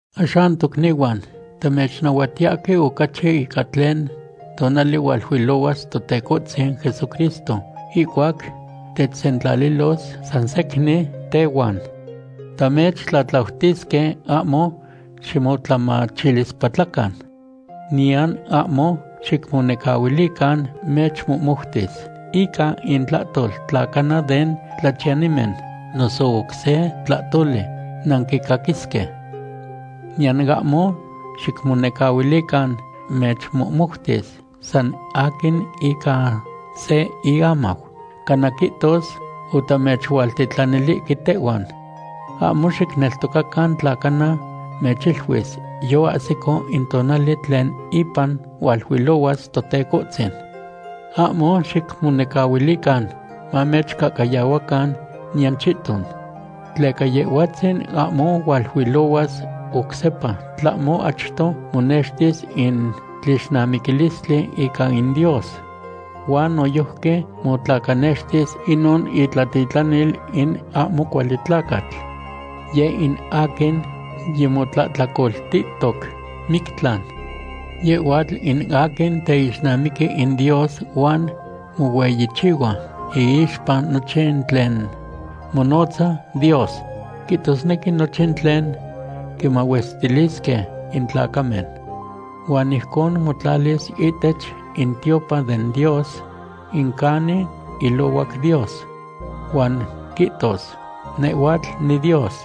Axan tocnihuan, tamechnahuatiyahque ocachi ica tlen tonali hualuilohuas Totecohtzin Jesucristo ihcuac techsentlalilos san secnin tehuan. Tamechtlatlautisque, ahmo ximotlamachilispatlacan. Niyan ahmo xicmonecahuilican mechmohmoutis ica intlahtol tla cana den tlachiyanimen, noso oc se tlahtoli nanquicaquisque. Niyan ahmo xicmonecahuilican mechmohmoutis san aquin ica se iamau, cana quihtos otamechualtitlanilihque tehhuan. Ahmo xicneltocacan tla cana mechiluis yoahsico in tonali tlen ipan hualuilohuas Totecohtzin. Ahmo xicmonecahuilican mamechcahcayahuacan niyan chihton. Tleca Yehhuatzin ahmo hualuilohuas oc sepa tlahmo achto monextis in tlixnamiquilistli ica in Dios. Huan noyojqui motlacanextis inon itlatitlanil in ahmo cuali tlacatl. Yeh in aquin yimotlahtlacoltihtoc mictlan. Yehhuatl in aquin teixnamiqui in Dios huan mohueyichihua iixpa nochin tlen monotza Dios, quihtosnequi nochin tlen quimahuestilisque in tlacamen. Huan ijcon motlalis ihtech in tiopan den Dios, in canin ilohuac Dios. Huan quihtos: “Nehhuatl niDios.”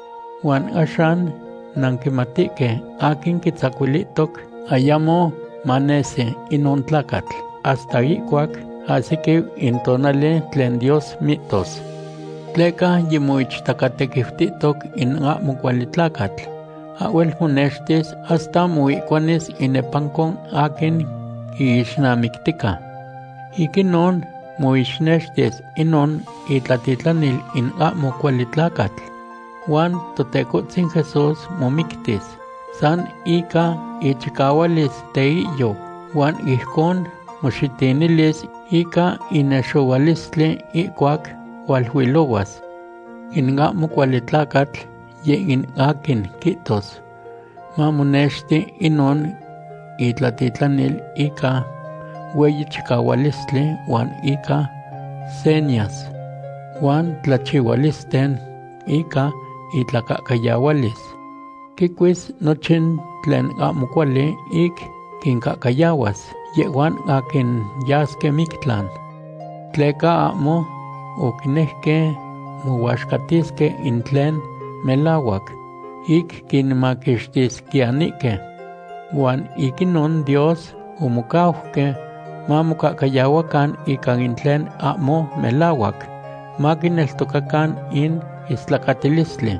Huan axan nanquimatihque aquin quitzacuilihtoc ayamo manesi inon tlacatl hasta ihcuac ahsiquiu in tonali tlen Dios mihtos. Tleca yimoichtacatequiutihtoc in ahmo cuali tlacatl. Ahhuel monextis hasta moihcuanis inepanco aquin quiixnamictica. Ic inon moixnextis inon itlatitlanil in ahmo cuali tlacatl. Huan Totecohtzin Jesús momictis san ica ichicahualis teihyou huan ijcon moxitinilis ica inexohualistli ihcuac hualuilohuas. In ahmo cuali tlacatl yeh in aquin quihtos mamonexti inon itlatitlanil ica hueyi chicahualistli huan ica senyas huan tlachihualisten ica itlacahcayahualis. Quicuis nochin tlen ahmo cuali ic quincahcayahuas yehhuan aquin yasque mictlan. Tleca ahmo oquinejque mohuaxcatisque in tlen melahuac, ic quinmaquixtisquiyanihque. Huan ic inon Dios omocauque mamocahcayahuacan ica in tlen ahmo melahuac, maquineltocacan in istlacatilistli.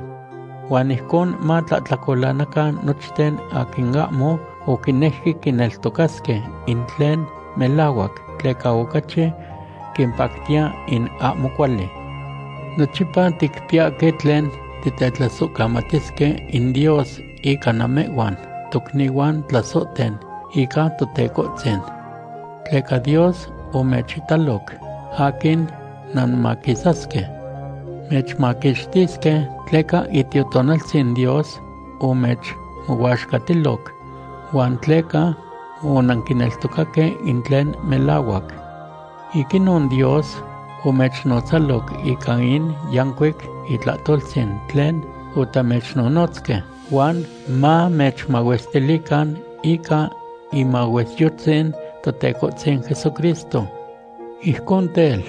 Huan ijcon matlahtlacolanacan nochten aquin ahmo oquinejque quineltocasque in tlen melahuac, tleca ocachi quimpactiya in ahmo cuali. Nochipa ticpiyahque tlen titetlasohcamatisque in Dios ica namehhuan tocnihuan tlasohten ica Totecohtzin. Tleca Dios omechitaloc aquin nanmaquisasque. Mechmaquixtisque tleca Itiotonaltzin Dios omechmohuaxcatiloc, huan tleca onanquineltocaque in tlen melahuac. Ic inon Dios omechnotzaloc ica in yancuic itlahtoltzin tlen otamechnonotzque, huan mamechmahuestilican ica imahuesyotzin Totecohtzin Jesucristo. Ijcon tel,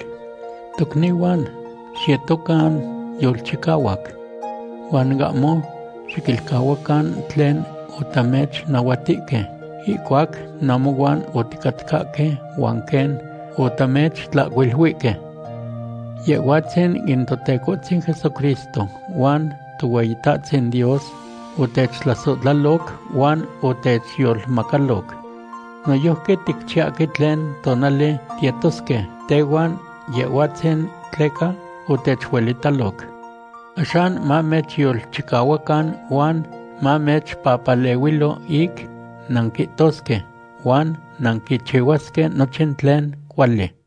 tocnihuan, xiyetocan yolchicahuac. Huan ahmo xiquilcahuacan tlen otamechnahuatihque ihcuac namohuan oticatcahque huan quen otamechtlahcuiluihque. Yehhuatzin in Totecohtzin Jesucristo huan Tohueyitahtzin Dios otechtlasohtlaloc huan otechyolmacaloc. Noyojqui ticchiyahque tlen tonali tiyetosque tehuan Yehhuatzin tleca otechuelitaloc. Axan mamechyolchicahuacan huan mamechpapalehuilo ic nanquihtosque huan nanquichihuasque nochin tlen cuali.